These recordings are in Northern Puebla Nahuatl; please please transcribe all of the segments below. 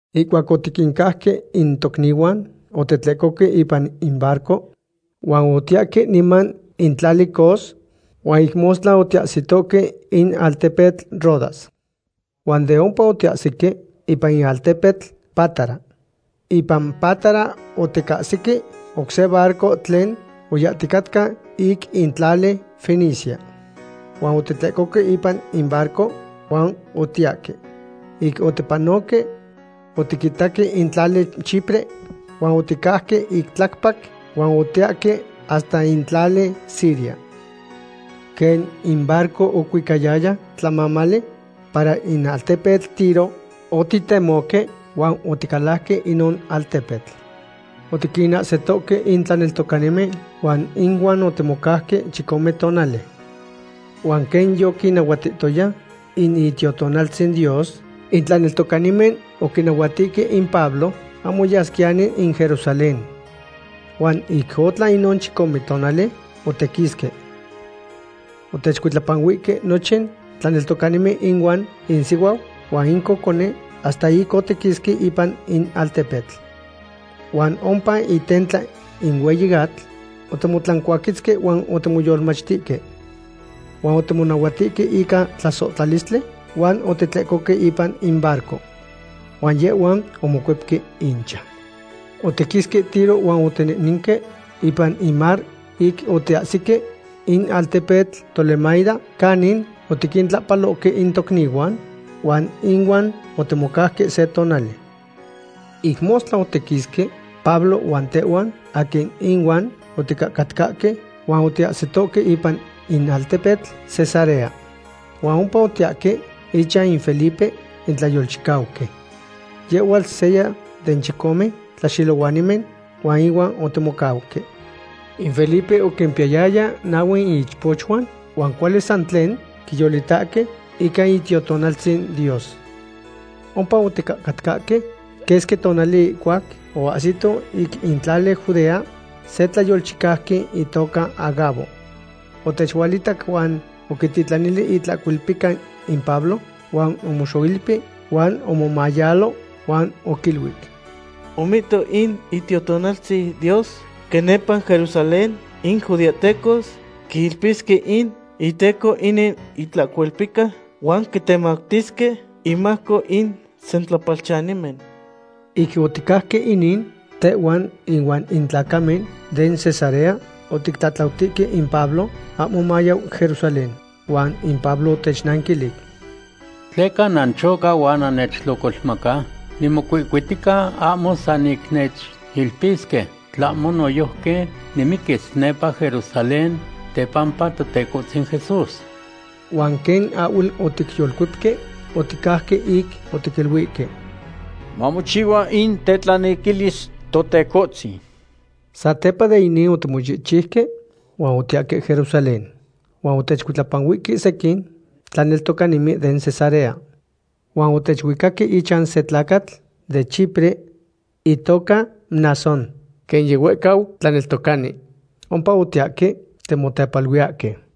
Ihcuac otiquincauque in tocnihuan, otitlecohque ipan in barco huan otiyahque niman in tlali Cos, huan ic mostla otiyahsitohque in altepetl Rodas. Huan de ompa otiyahsique ipan in altepetl Pátara. Ipan Pátara oticahsique oc se barco tlen oyahticatca ic in tlali Fenicia. Huan otitlecohque ipan in barco huan otiyahque. Ic otipanoque, otiquitaque in tlali Chipre huan oticauque ic tlacpac, huan otiyahque hasta in tlali Siria. Quen in barco ocuicayaya tlamamali para in altepetl Tiro, otitemohque huan oticalajque inon altepetl. Otiquinahsitohque in tlaneltocanimen huan inuan otimocauque chicome tonali. Huan quen yoquinnahuahtihtoya in Itiotonaltzin Dios, in tlaneltocanimen oquinahuatihque in Pablo ahmo yasquiyani in Jerusalén. Huan ic otlan inon chicome tonali, otiquisque. Otechcuitlapanuihque nochin tlaneltocanimen inuan insihuau huan in cocone hasta ic otiquisque ipan in altepetl. Huan ompa itentla in hueyi atl otimotlancuaquetzque huan otimoyolmachtihque. Huan otimonahuatihque ica tlasohtlalistli huan otitlecohque ipan in barco. Huan yehhuan omocuepque inchan. Otiquisque Tiro huan otinehnenque ipan in mar ic otiyahsique in altepetl Tolemaida canin otiquintlahpalohque in tocnihuan huan inuan otimocauque se tonali. Ic mostla otiquisque, Pablo huan tehhuan aquin ihuan oticatcahque, huan otiyahsitohque ipan in altepetl Cesarea. Huan ompa otiyahque ichan in Felipe in tlayolchicauqui. Yehhuatl seya den chicome tlaxelohuanimen, huan ihuan otimocauque. In Felipe oquimpiyayaya nahue ichpochuan, huan cuali san tlen quiyolitahque ica Itiotonaltzin Dios. Ompa oticatcahque quesqui tonali ihcuac oahsito ic in tlali Judea se tlayolchicauqui itoca Agabo. Otechualitac huan oquitilanili itlahcolpica in Pablo, huan omoxoilpi, huan omomayalo, huan oquiluic: ―Omihto in Itiotonaltzin Dios quen nepa Jerusalén in judeahtecos quiilpisque in iteco inin itlahcolpica huan quitemactisque inmajco in sentlapalchanimen. Ic oticajque inin, tehhuan inuan in tlacamen den Cesarea otictlatlautihque in Pablo ahmo mayau Jerusalén. Huan in Pablo otechnanquilic: ―¿Tleca nanchocahque huan nannechtlocolmaca? Nimocuihcuitica ahmo san ic nechilpisque, tlahmo noyojqui nimiquis nepa Jerusalén tepampa Totecohtzin Jesús. Huan quen ahhuel oticyolcuepque, oticauque ic otiquiluihque: ―Mamochihua in tetlanequilis Totecohtzin. Satepa de inin otimochihchiuque huan otiyahque Jerusalén. Huan otechcuitlapanuihque sequin tlaneltocanimen den Cesarea. Huan otechuicaque ichan se tlacatl de Chipre itoca Mnasón, quen yihuehcau tlaneltocani. Ompa otiyahque timotepaluiyahque.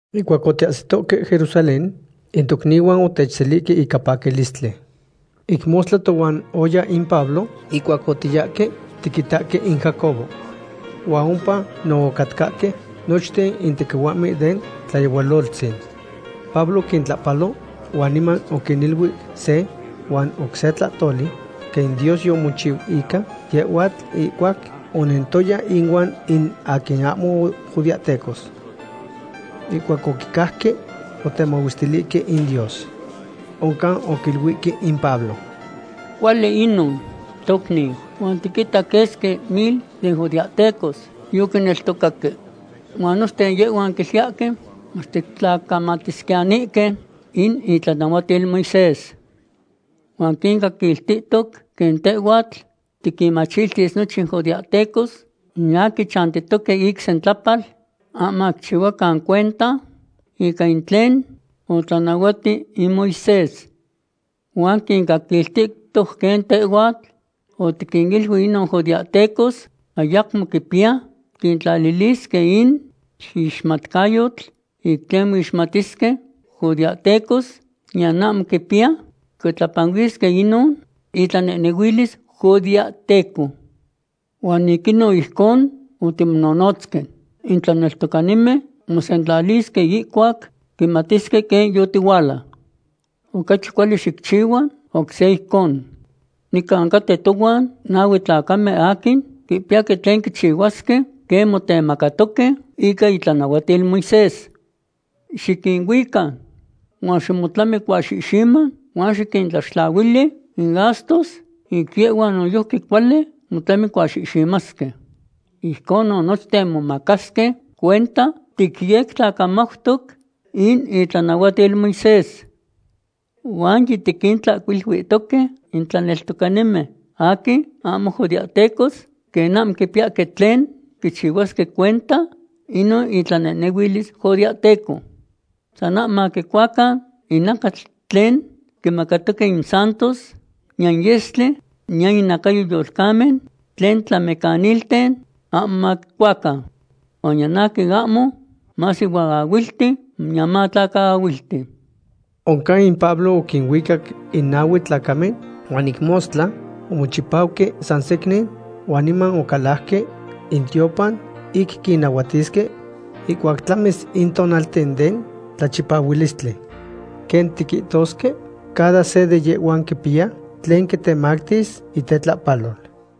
Ihcuac otiyahsitohque Jerusalén, in tocnihuan otechselihque ica paquilistli. Ic mostla tohuan oya in Pablo ihcuac otiyahque tiquitahque in Jacobo. Huan ompa no ocatcahque nochten in tequihuahmen den tlayehualotzin. Pablo oquintlahpalo huan niman oquiniluic se huan oc se tlahtoli, quen Dios yomochiu ica yehhuatl ihcuac onentoya inuan in aquin ahmo judeahtecos. Ihcuac oquicajque, otemahuestilihque in Dios. Oncan oquiluihque in Pablo: ―Cuali inon, tocniu, huan tiquita quesqui mil den judeahtecos yoquineltocaque. Huan nochten yehhuan quiluiyahque mach titlacamatisquiyanihque in itlanahuatil Moisés. Huan quincaquiltihtoc quen tehhuatl tiquinmachtis nochin judeahtecos in aquin chantihque ic sentlapal, ahmo maquichihuacan cuenta ica in tlen otlanahuati in Moisés. Huan quincaquiltihtoc quen tehhuatl otiquiniluic inon judeahtecos ayacmo quipiya quintlalilisque in ixmatcayotl ic tlen moixmatisque judeahtecos, niyan ahmo quipiya quicuitlapanuisque inon itlanehnehuilis judeahteco. Huan ic inon ijcon otimonohnotzque. In tlaneltocanimen mosentlalisque ihcuac quimatisque quen yotihuala. Ocachi cuali xicchihua oc se ijcon. Nican caten tohuan nahue tlacamen aquin quipiyahque tlen quichihuasque quen motemacatoque ica itlanahuatil Moisés. Xiquinuica huan ximotlamicuaxihxima huan xiquintlaxtlahuili in gastos ic yehhuan noyojqui cuali motlamicuaxihximasque. Ijconon nochten momacasque cuenta ticyectlacamautoc in itlanahuatil Moisés. Huan yitiquintlahcuiluihtoque in tlaneltocanimen aquin ahmo judeahtecos, quen ahmo quipiyahque tlen quichihuasque cuenta inon itlanehnehuilis judeahteco. San ahmo maquicuacan in nacatl tlen quimacatoque in santos, niyan in yestli, niyan inacayo yolcamen tlen tlamecanilten ahmo maquicuacan. Huan niyan aquin ahmo masihuaahuilti niyan matlacaahuilti. Oncan in Pablo oquinuicac in nahue tlacamen huan ic mostla omochipauque san secnin huan niman ocalajque in tiopan ic quinnahuatisque ihcuac tlamis in tonalten den tlachipahualistli. Quen tiquihtosque, cada se de yehhuan quipiya tlen quitemactis itetlahpalol.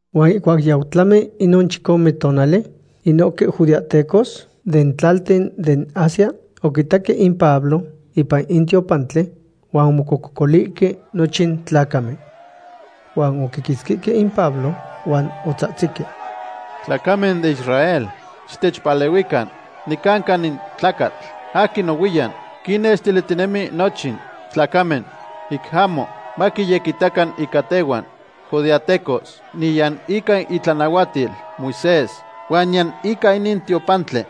Huan ihcuac yau tlami inon chicome tonali, inohque judeahtecos den tlalten den Asia oquitaque in Pablo ipan in tiopantli huan omocococolihque nochin tlacamen. Huan oquiquitzquihque in Pablo, huan otzahtzihque: ―Tlacamen den Israel, xitechpalehuican. Nicanca in tlacatl aquin nohuiyan quinnextilihtinemi nochin tlacamen ic ahmo maquiyequitacan ica tehhuan judeahtecos, niyan ica itlanahuatil Moisés, huan niyan ica inin tiopantli.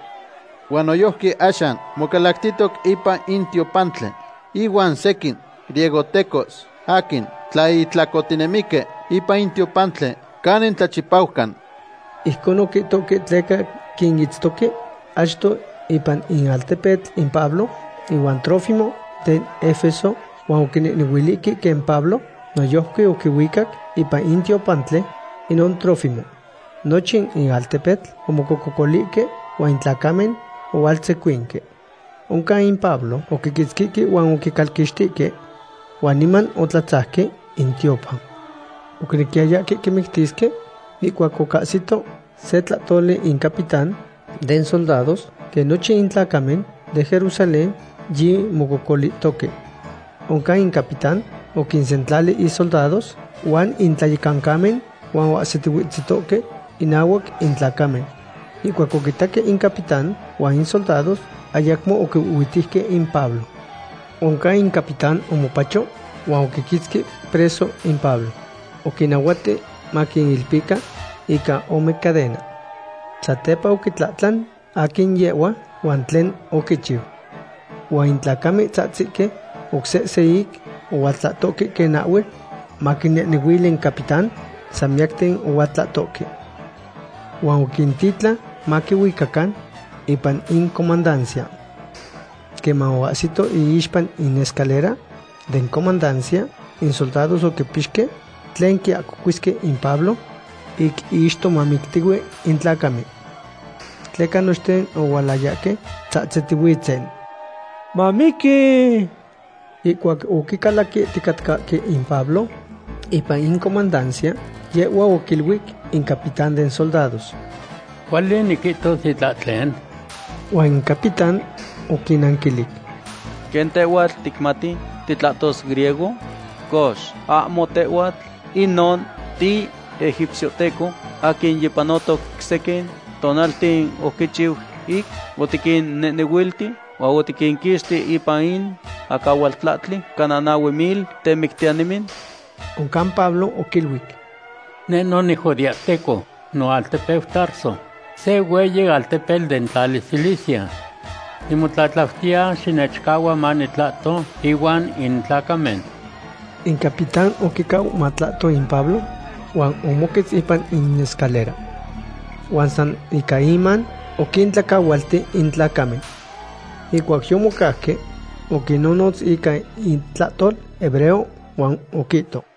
Huan noyojqui axan mocalactihtoc ipan in tiopantli inuan sequin griegohtecos aquin tlaihtlacohtinemihque ipan in tiopantli canin tlachipaucan. Ijcon oquihtohque tleca quinitztoque achto ipan in altepetl in Pablo ihuan Trófimo den Efeso, huan oquinehnehuilihque quen Pablo noyojqui oquihuicac ipan in tiopantli inon Trófimo. Nochin in altepetl omocococolihque huan in tlacamen ohualtzecuinque. Oncan in Pablo oquiquitzquihque huan oquicalquixtihque. Huan niman otlatzajque in tiopan. Oquinequiyayahque quimictisque ihcuac ocahsito se tlahtoli in capitán den soldados quen nochin in tlacamen den Jerusalén yimococolihtohque. Oncan in capitán oquinsentlali isoldados huan in tlayecancamen, huan oahsitihuetzitohque inahuac in tlacamen. Ihcuac oquitaque in capitán huan in soldados, ayacmo oquihuihhuitejque in Pablo. Oncan in capitán omopacho huan oquiquitzqui preso in Pablo. Oquinnahuati maquiilpican ica ome cadena. Satepa oquitlahtlan aquin yehhua huan tlen oquichiu. Huan in tlacamen tzahtzique oc sehse ic ohualtlahtohque quen ahhuel maquinehnehuili in capitán, san miyacten ohualtlahtohque. Huan oquintitlan maquihuicacan ipan in comandancia. Queman oahsito iixpa in escalera den comandancia, in soldados oquipixque tlen quiahcocuisque in Pablo ic ixtomamictihue in tlacamen. Tleca nochten ohualayahque icuitlapa tzahtzitihuitzen: ―¡Mamiqui! Ihcuac oquicalaquihticatcahque in Pablo ipan in comandancia, yehhua oquiluic in capitán den soldados: ―¿Cuali niquihtos itlahtlen? Huan in capitán oquinanquilic: ―¿Quen tehhuatl ticmati titlahtos griego? Cox, ¿ahmo tehhuatl inon tiegipciohteco aquin yipanotoc sequin tonalten oticchiu ic otiquinnetehuilti, huan otiquinquixti ipan in acahualtlahtli cana nahue mil temictiyanimen? Oncan Pablo oquiluic: ―Neh no nijudeahteco, noaltepeu Tarso, se hueyi altepetl den tlali Cilicia. Nimotlatlautiya xinechcahua manitlahto ihuan in tlacamen. In capitán oquicau matlahto in Pablo, huan omoquetz ipan in escalera. Huan san ica iman oquintlacahualti in tlacamen. Ihcuac yomocauque, oquinnohnotz ica itlahtol hebreo, huan oquihto: